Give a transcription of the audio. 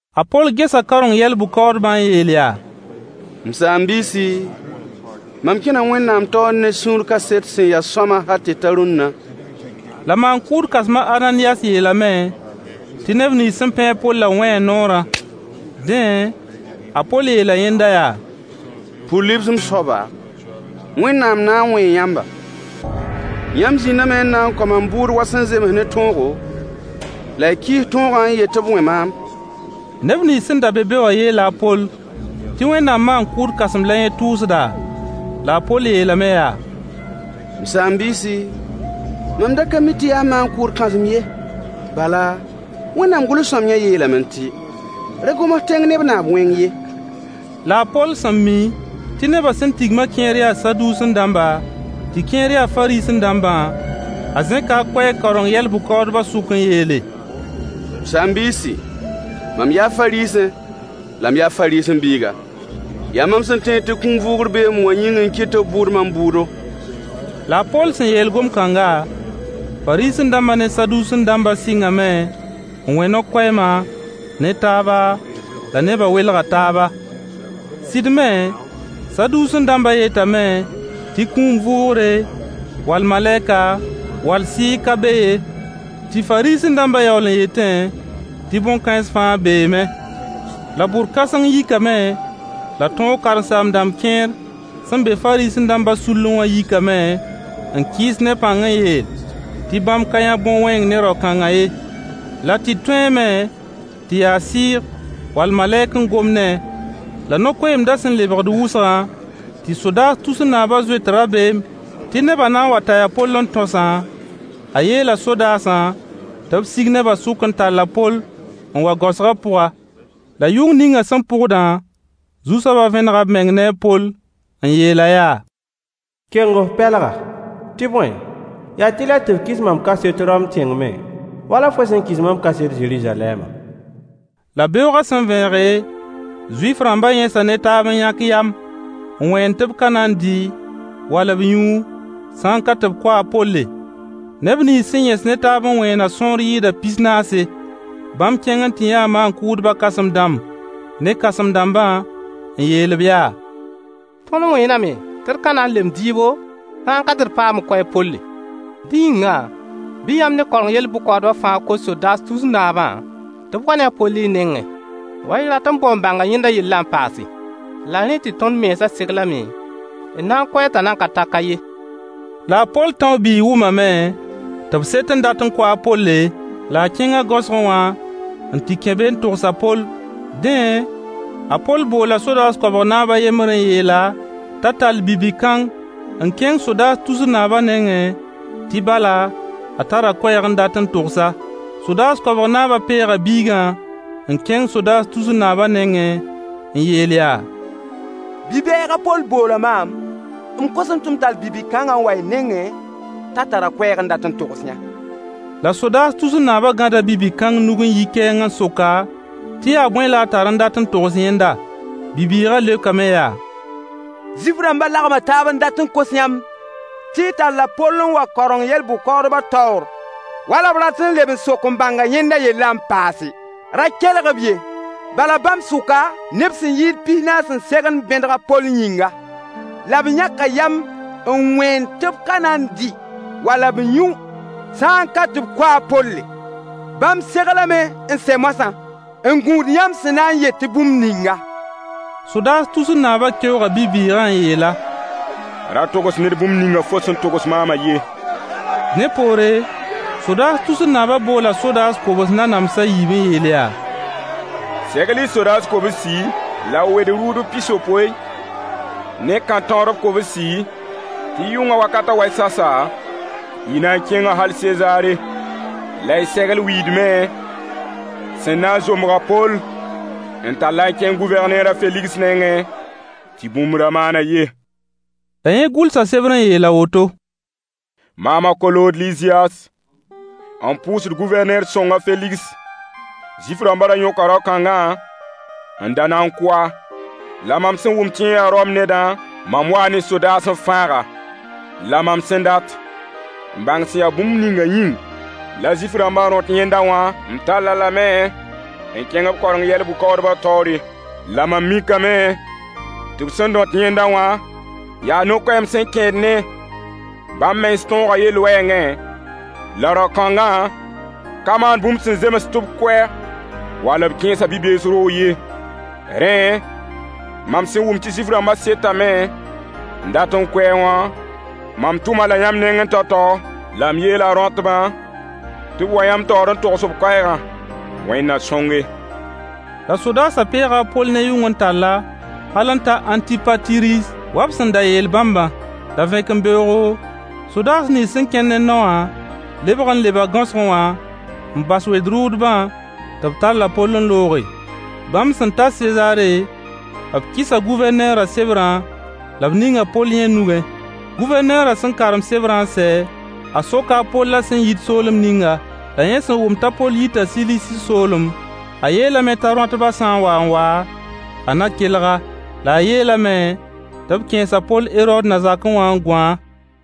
A Poll gesa kaoreng yɛl-bʋ-kaoodbã n yeel yaa: M saam-biisi, mam kẽna Wẽnnaam taoor ne sũur kaset sẽn ya sõama hal tɩ ta rũnna. La maan-kʋʋd kãsem a Ananiyas yeelame tɩ neb nins sẽn pẽ a Pollã wẽ a noorã. Dẽ, a Poll yeela yẽnda yaa: Pʋ-libsem soaba, Wẽnnaam na n wẽe yãmba. Yãmb zĩndame n na n kao mam bʋʋd wa sẽn zems ne tõogo, la y kɩɩs tõogã n yet tɩ b wẽ maam. Neb nins sẽn da be be wã yeela a Poll tɩ Wẽnnaam maan-kʋʋd kãsem la yẽ tʋʋsda. La a Poll yeelame yaa: M saam-biisi, mam da ka mi tɩ yaa maan-kʋʋd kãsem ye, bala, Wẽnnaam gʋls-sõamyã yeelame tɩ: “Ra gom f tẽng neb naab wẽng ye.” La a Poll sẽn mi tɩ nebã sẽn tigma kẽer yaa Saduusẽ-dãmba tɩ kẽer ya Fariisẽ-dãmbã, a zẽka a koɛɛg kaoreng yɛl-bʋ-kaoodbã sʋk n yeele: M saam-biisi, mam yaa Fariisẽ, la m yaa Fariisẽ biiga. Yaa mam sẽn tẽed tɩ kũum vʋʋgr beene wã yĩng n kɩt tɩ b bʋʋd mam bʋʋdo. La a Poll sẽn yeel gom-kãnga, Fariisẽ-dãmbã ne Saduusẽ-dãmbã sɩngame n wẽ no-koɛɛma ne taaba, la nebã welga taaba. Sɩd me, Saduusẽ-dãmbã yetame tɩ kũum vʋʋgre, wall malɛka wall Sɩɩg ka be ye. Tɩ Fariisẽ-dãmba yaool n yetẽ tɩ bõn-kãens fãa beeme. La bʋr-kãseng yikame, la tõog karen-saam-dãmb kẽer sẽn be Fariisẽ-dãmba sullẽ wã yikame n kɩɩs ne pãng n yeel tɩ bãmb ka yã bõn-wẽng ne rao-kãngã ye, la tɩ tõeeme tɩ yaa sɩɩg wall malɛk n gom ne-a. La no-koeemdã sẽn lebgd wʋsgã, tɩ sodaas tusr naabã zoet rabeem tɩ nebã na n wa tae a Poll n tõsã, a yeela sodaasã tɩ b sig nebã sʋk n tall a Poll n wa gãosgã pʋga. La yʋng ninga sẽn pʋgdã, Zu-soaba vẽnega b meng ne a Poll n yeel-a yaa: keng f pɛlga, tɩ bõe, yaa tɩlɛ tɩ f kɩs mam kaset Rom tẽng me wala fo sẽn kɩs mam kaset Zeruzalɛma. La beoogã sẽn vẽege, Zuif-rãmba yẽsa ne taab n yãk yam n wẽen tɩ b ka na n dɩ wall b yũ, sã n ka tɩ b kʋʋ a Polle. Neb nins sẽn yẽs ne taab n wẽena sõor yɩɩda pis-naase. Bãmb kẽng n tɩ yãa maan-kʋʋdbã kãsem-dãmb ne kãsem-dãmbã n yeel-b yaa: Tõnd wẽename tɩ d ka na n lemb dɩɩbo, sã n ka tɩ d paam n kʋʋ a Polle. Dẽ yĩngã, bɩ yãmb ne kaoreng yɛl-bʋ-kaoodba fãa kos sodaas tusr naabã tɩ b wa ne a Poll y nengẽ, wa y rat n baoo n bãnga yẽnda yellã n paase. La rẽ tɩ tõnd mensa seglame n na n kʋ-a t'a nan ka ta ka ye. La a Poll tão biig wʋmame tɩ b set n dat n kʋʋ a Polle, la a kẽnga gãosgẽ wã n tɩ kẽ be n togs a Poll. Dẽ, a Poll boola sodaas koabg naab a yembr n yeel-a t'a tall bi-bɩ-kãng n kẽng sodaas tusr naabã nengẽ, tɩ bala, a tara koɛɛg n dat n togs-a. Sodaas koabg naabã peega biigã n kẽng sodaas tusr naabã nengẽ n yeel yaa: Bi-bɛɛg a Poll boola maam n kos-m tɩ m tall bi-bɩ-kãngã n wa y nengẽ t'a tara koɛɛg n dat n togs-yã. La sodaas tusr naabã gãda bi-bɩ-kãng nug n yi kɛɛng n sok-a tɩ yaa bõe la a tar n dat n togs yẽnda. Bi-bɩɩgã leokame yaa: Zuif-rãmba lagma taab n dat n kos yãmb tɩ y tall a Poll n wa kaoreng yɛl-bʋ-kaoodbã taoor wala b rat n leb n sok n bãnga yẽnda yellã n paase. Ra kelg-y-b ye, bala, bãmb sʋka neb sẽn yɩɩd pis-naas n segend bẽdg a Poll yĩnga, la b yãka yam n wẽen tɩ b ka na n dɩ wala b yũ sã n ka tɩ b kʋ a Polle. Bãmb seglame n sɛ moasã n gũud yãmb sẽn na n yet tɩ bũmb ninga. Sodaas tusr naabã keooga bi-bɩɩgã n yeel-a: Ra togs ned bũmb ninga fo sẽn togs maama ye. Dẽ poore, sodaas tusr naabã boola sodaas kobs nanams a yiib n yeel yaa: Segl-y sodaas kobs-yi la wed-rʋʋdb pis-yopoe, ne kãn-tãoodb kobs-yi tɩ yʋngã wakat a wɛ sasa, y na n kẽnga hal Sezaare. La y segl wiid me sẽn na n zombg a Poll n tall-a n kẽng Gʋvɛrneer a Feligs nengẽ tɩ bũmb ra maan-a ye. La yẽ gʋlsa sebr n yeel a woto: Maam a Kolood Liziyaas n pʋʋsd Gʋvɛrneer sõng a Feligs. Zuif-rãmbã ra yõka rao-kãngã n da na n kʋ-a, la mam sẽn wʋm tɩ yẽ yaa Rom nedã, mam waa ne sodaas n fãag-a. La mam sẽn dat n bãng sẽn ya bũmb ninga yĩng la Zuif-rãmbã rõt yẽnda wã, m tall-a lame n kẽng b kaoreng yɛl-bʋ-kaoodbã taoore. La mam mikame tɩ b sẽn dõt yẽnda wã yaa no-koɛɛm sẽn kẽed ne bãmb mens tõoga yell wɛɛngẽ, la rao-kãngã ka maan bũmb sẽn zems tɩ b kʋ-a wall b kẽes-a bi-bees roog ye. Dẽ, mam sẽn wʋm tɩ Zuif-rãmbã setame n dat n kʋ-a wã, mam tʋm-a-la yãmb nengẽ tao-tao la m yeela a rõatbã tɩ b wa yãmb taoor n togs b koɛɛgã. Wẽnd-na sõnge. La sodaasã peega a Poll ne yʋng n tall-a hal n ta Ãntipatiris wa b sẽn da yeel bãmbã. La vẽkembeoogo, sodaas nins sẽn kẽn ne nao wã lebg n leba gãosgẽ wã n bas wed-rʋʋdbã tɩ b tall a Poll n looge. Bãmb sẽn ta Sezaare, b kɩsa Gʋvɛrneerã sebrã la b ning a Poll yẽ nugẽ. Gʋvɛrneerã sẽn karem sebrã n sɛ, a soka a Poll a sẽn yit soolem ninga. La yẽ sẽn wʋm t'a Poll yita Silisi soolem, A yeelame t'a rõatbã sã n wa n wa, a na kelg-a. La a yeelame tɩ b kẽes a Poll Herood na-zakẽ wã n gũ-a.